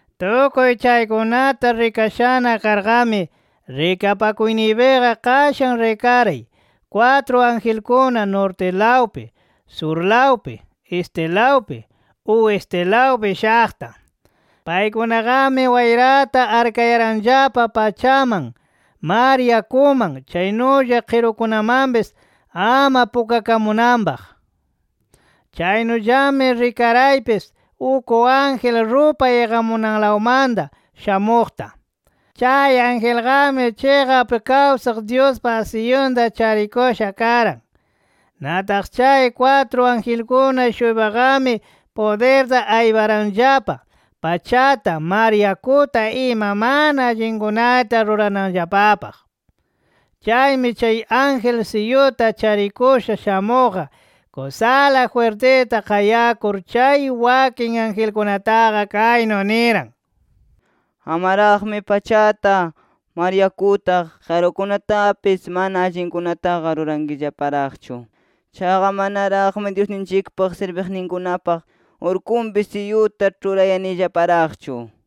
Tukuy chaykunata rikashana karqami, rikapakuyniypiqa qashan rikaray, kwatru angelkuna, nortilawpi, surlawpi, estilawpi, oestilawpi shaqta. Paykunaqami wayrata arkayaranllapa pachaman, mar yakuman, chaynulla qirukunamanpis ama pukakamunanpaq. Chaynullami rikaraypis uk ángel rupay iqamunanlawmanta shamuqta. Chay angelqami chiqap kawsaq Dyuspa siyunta charikusha karan. Nataq chay kwatru angelkuna-shuypaqami pudirta ayparanllapa pachata, mar yakuta ima mana allinkunata rurananllapapaq. Chaymi chay ángel siyuta charikusha shamuqqa, kusala jwirtita qayakur chay wakin angelkunataqa kaynu niran: “Amaraqmi pachata, mar yakuta, qirukunatapis mana allinkunataqa rurankillaparaqchu. Chaqa manaraqmi Dyusninchikpa sirbiqninkunapa urkunpi siyuta ĉhurayanillaparaqchu” nir.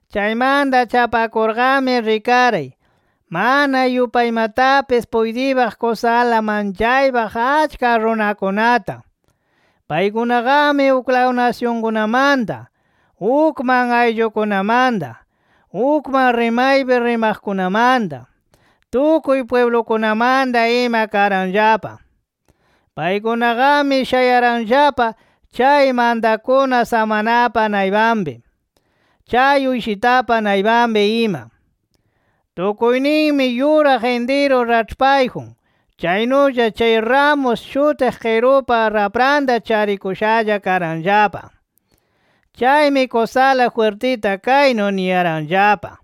Chaymanta chapakurqami rikaray, mana yupaymatapis puytiypaq kusala manchaypaq achka runakunata. Paykunaqami uklaw nasyunkunamanta, ukman ayllukunamanta, ukman rimaypi rimaqkunamanta, tukuy pwiblukunamanta ima karanllapa. Paykunaqami shayaranllapa chay mantakuna samanapa naypanpi, chay Uyshitapa naypanpi ima. Tukuyninmi yuraq intiru raĉhpayjun, chaynulla chay ramus shutiq qirupa rapranta charikushalla karanllapa. Chaymi kusala jwirtita kaynu niyaranllapa: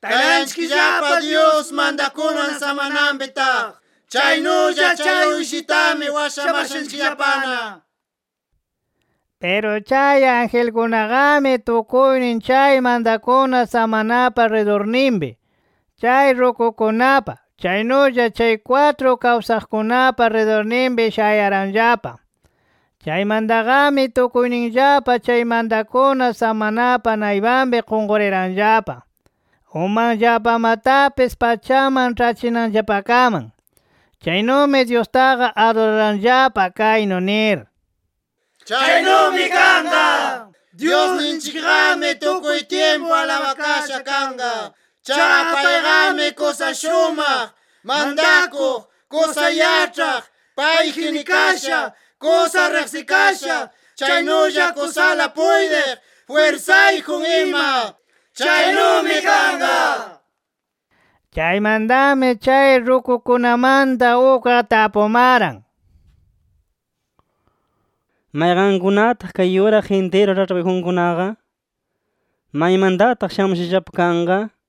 “¡Taytanchikllapa Dyus mantakunan samananpi taq, chaynulla chay Uyshitami washamashanchikllapana!” nir. Piru chay angelkunaqami tukuynin chay mantakuna samanapa ridurninpi, chay rukukunapa, chaynulla chay kwatru kawsaqkunapa ridurninpi shayaranllapa. Chaymantaqami tukuyninllapa chay mantakuna samanapa naypanpi qunquriranllapa, umanllapamatapis pachaman ĉhachinanllapakaman. Chaynumi Dyustaqa aduraranllapa, kaynu nir: “¡Chaynumi kanqa! Dyusninchikqami tukuy tyimpu alabakasha kanqa. Chaqa payqami kusa shumaq, mantakuq, kusa yaĉhaq, payji nikasha, kusa riqsikasha, chaynulla kusala puytiq, jwirsayjun ima. ¡Chaynumi kanqa!” Chaymantami chay rukukunamanta ukqa tapumaran: “¿Mayqankunataq kay yuraq intiru raĉhpayjunkunaqa? ¿Maymantataq shamushallapa kanqa?” nir.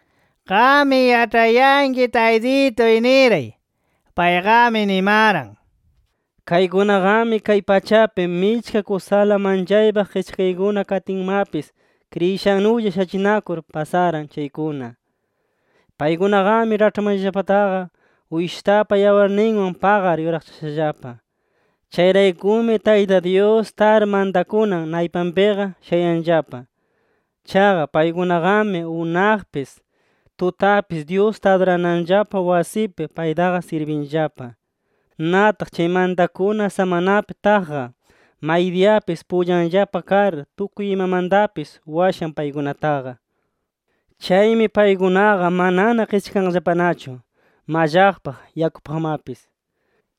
“Qammi yaĉhayanki Taytituy” niray. Payqami nimaran: “Kaykunaqami kay pachapi michka kusala manchaypaq qischakaykuna katinmapis kriyishannulla shachinakur pasaran chaykuna. Paykunaqami raĉhpanllapataqa, Uyshitapa yawarninwan paqar yuraqchashallapa. Chayraykumi, Tayta Dyus tar mantakunan naypanpiqa shayanllapa. Chaqa paykunaqami unaqpis, tutapis Dyusta adurananllapa wasipi paytaqa sirbinllapa. Nataq chay mantakuna samanapi taqqa, maydiyapis pullanllapa kar tukuy imamantapis washan paykunataqa. Chaymi paykunaqa manana qischakanqallapanachu mallaqpaq, yakupaqmapis.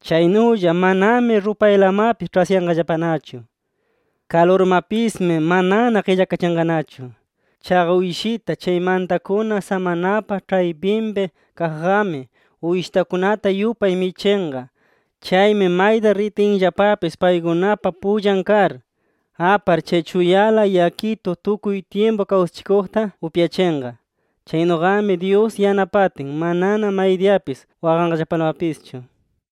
Chaynulla manami rupaylamapis ĉhasyanqallapanachu. Kalurmapismi manana qillakachinqanachu. Chaqa Uyshita, chay mantakuna samanapa ĉhaypinpi kaqqami, uyshitakunata yupay michinqa. Chaymi mayta ritinllapapis paykunapa pullan kar, apar chay chuyala yakitu tukuy tyimpu kawsachikuqta upyachinqa. Chaynuqami Dyus yanapatin, manana maydiyapis waqanqallapalamapischu”.